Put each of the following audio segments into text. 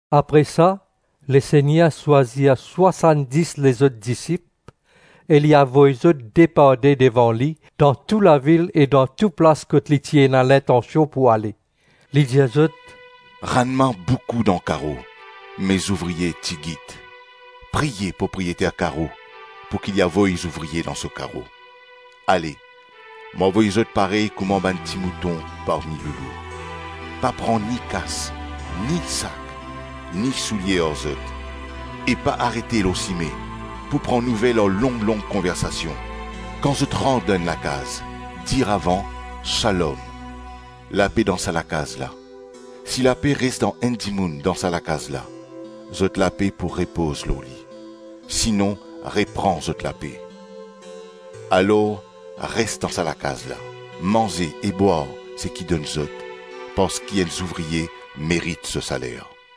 Apre sa Lesegner swazir swasann-dis lezot disip, e li avoy zot de par de devan li dan tou lavil e tou plas kot li ti ena lintansion pou ale. Li dir zot, “Rannman boukou dan karo me zouvrie tigit; priye Propriyeter karo pouki li avoy zouvrie dan so karo. Ale! Mo avoy zot parey kouma bann timouton parmi loulou. Pa pran ni kas, ni sak, ni soulie ar zot. E pa arete lor sime pou pran nouvel ar long-long konversasion. Kan zot rant dan enn lakaz, dir avan, ‘Shalom, lape dan sa lakaz la!’ Si lape res dan enn dimoun dan sa lakaz la, zot lape pou repoz lor li; sinon repran zot lape. Alor res dan sa lakaz la, manze e bwar seki donn zot, parski enn zouvrie merit so saler.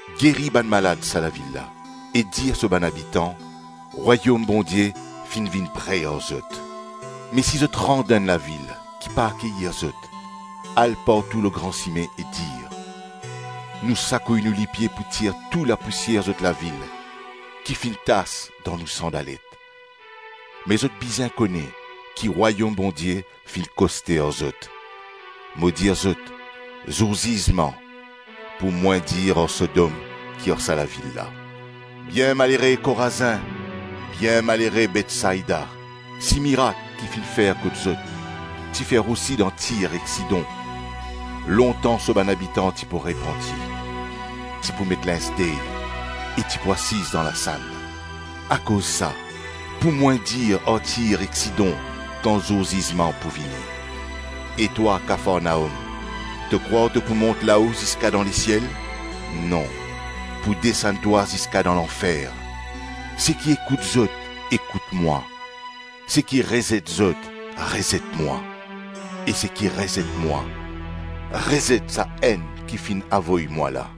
geri bann malad sa lavil la e dir so bann abitan, ‘Rwayom Bondie finn vinn pre ar zot.’ Me si zot rant dan enn lavil ki pa akeyir zot, al partou lor gran sime e dir, ‘Nou sakouy nou lipie pou tir tou lapousier zot lavil ki finn tas dan nou sandalet; me zot bizin kone ki Rwayom Bondie finn koste ar zot.’ Mo dir zot, zour zizman pou mwin dir ar Sodom ki ar sa lavil la. Bienmalere Korazin! Bienmalere Betsaida! Si mirak ki finn fer kot zot, ti fer osi dan Tir ek Sidon, lontan so bann abitan ti pou repanti, ti pou met linz dey, e ti pou asiz dan lasann. Akoz sa, pou mwin dir ar Tir ek Sidon kan zour zizman pou vini. E twa Kafarnaom, to krwar to pou mont lao ziska dan lesiel? Non, pou desann twa ziska dan lanfer. Seki ekout zot, ekout mwa; seki rezet zot, rezet mwa, e seki rezet mwa, rezet Sa-Enn ki finn avoy mwa la.”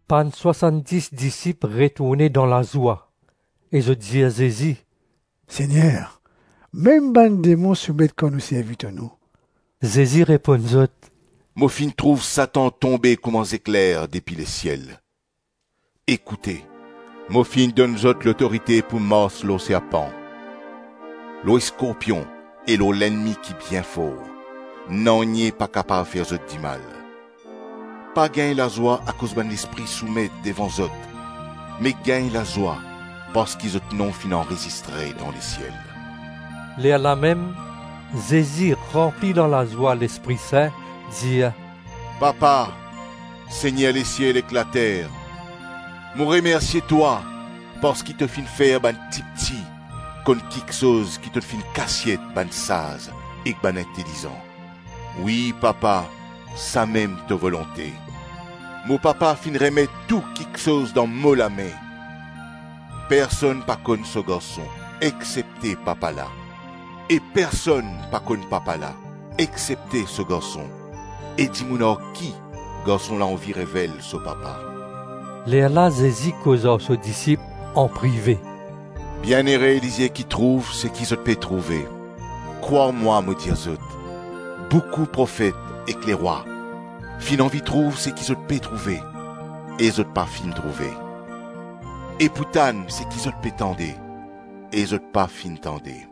Bann swasann-dis disip retourne dan lazwa, e zot dir Zezi, “Segner, mem bann demon soumet kan nou servi to nom!” Zezi reponn zot, “Mo finn trouv Satan tonbe kouma zekler depi lesiel. Ekoute, mo finn donn zot lotorite pou mars lor serpan, lor skorpion e lor lennmi ki bien for; nanye pa kapav fer zot dimal. Pa gagn lazwa akoz bann lespri soumet devan zot, me gagn lazwa parski zot nom finn anrezistre dan lesiel.” Lerlamem, Zezi, ranpli dan lazwa Lespri Sin dir, “Papa, Segner lesiel ek later, mo remersie twa parski to finn fer bann tipti konn kiksoz ki to finn kasiet bann saz ek bann intelizan. Wi, papa, samem to volonte. Mo Papa finn remet tou kiksoz dan mo lame. Personn pa konn so Garson, exsepte Papa la, e personn pa konn Papa la exsepte so Garson e dimoun ar ki Garson la anvi revel so Papa. Lerla Zezi koz ar so disip anprive, “Bienere lizie ki trouv seki zot pe trouve! Krwar mwa mo dir zot, boukou profet ek lerwa finn anvi trouv seki zot pe trouve, e zot pa finn trouve, e pou tann seki zot pe tande, e zot pa finn tande.”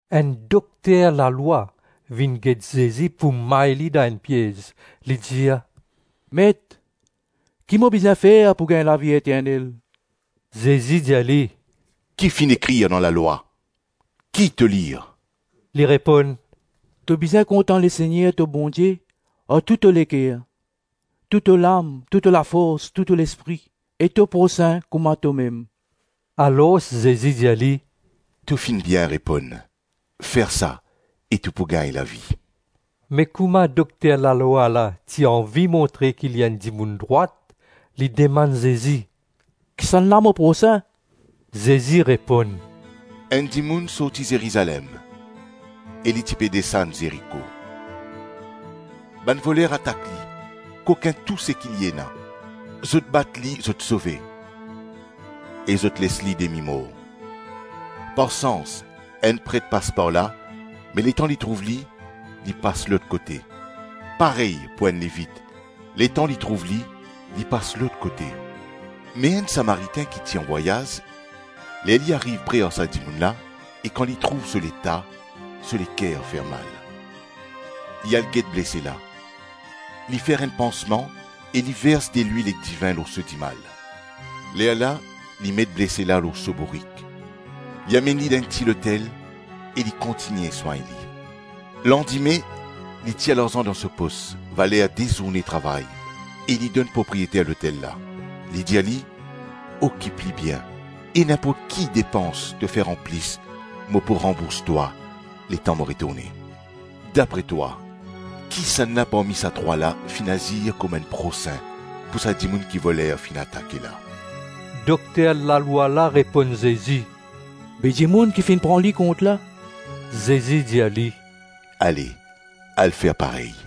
Enn dokter lalwa vinn get Zezi pou may li dan enn piez, li dir, “Met, ki mo bizin fer pou gagn lavi eternel?” Zezi dir li, “Ki finn ekrir dan lalwa? Ki to lir?” Li reponn, “To bizin kontan Lesegner to Bondie ar tou to leker, tou to lam, tou to lafors, tou to lespri e to prosin kouma tomem.” Alors Zezi dir li, “To finn bien reponn. Fer sa, e to pou gagn lavi.” Me kouma dokter lalwa la ti anvi montre ki li enn dimoun drwat, li dimann Zezi, “Kisannla mo prosin?” Zezi reponn, “Enn dimoun sorti Zerizalem e li ti pe desann Zeriko. Bann voler atak li, kokin tou seki li ena, zot bat li, zot sove, e zot les li demi-mor. Par sans, enn pret pas par la me letan li trouv li, li pas lot kote. Parey pou enn Levit; letan li trouv li, li pas lot kote. Me enn Samaritin ki ti anvwayaz, ler li ariv pre ar sa dimoun la e kan li trouv so leta, so leker fermal. Li al get blese la, li fer enn pansman e li vers delwil ek divin lor so dimal. Lerla li met blese la lor so bourik, li amenn li dan enn ti lotel e li kontigne swagn li. Landime, li tir larzan dan so pos, valer de zourne travay e li donn propriyeter lotel la. Li dir li, ‘Okip li bien, e ninport ki depans to fer anplis mo pou ranbours twa letan mo retourne.’ Dapre twa, kisannla parmi sa trwa la finn azir kouma enn prosin pou sa dimoun ki voler finn atake la?” Dokter lalwa la reponn Zezi, “Be dimoun ki finn pran li kont la.” Zezi dir li, “Ale, al fer parey.”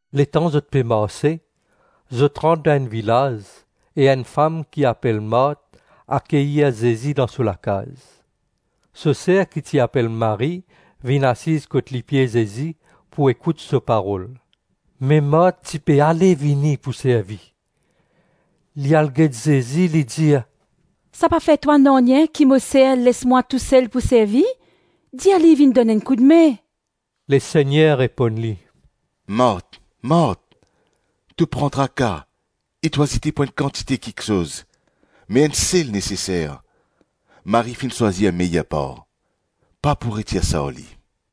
Letan zot pe marse, zot rant dan enn vilaz, e enn fam ki apel Mart akeyir Zezi dan so lakaz. So ser ki ti apel Marie vinn asiz kot lipie Zezi pou ekout so parol. Me Mart ti pe ale-vini pou servi. Li al get Zezi, li dir, “Sa pa fer twa nanye ki mo ser les mwa tousel pou servi? Dir li vinn donn enn koudme.” Lesegner reponn li, “Mart, Mart, to pran traka e to azite pou enn kantite kiksoz, me enn sel neseser. Marie finn swazir meyer par, pa pou retir sa ar li.”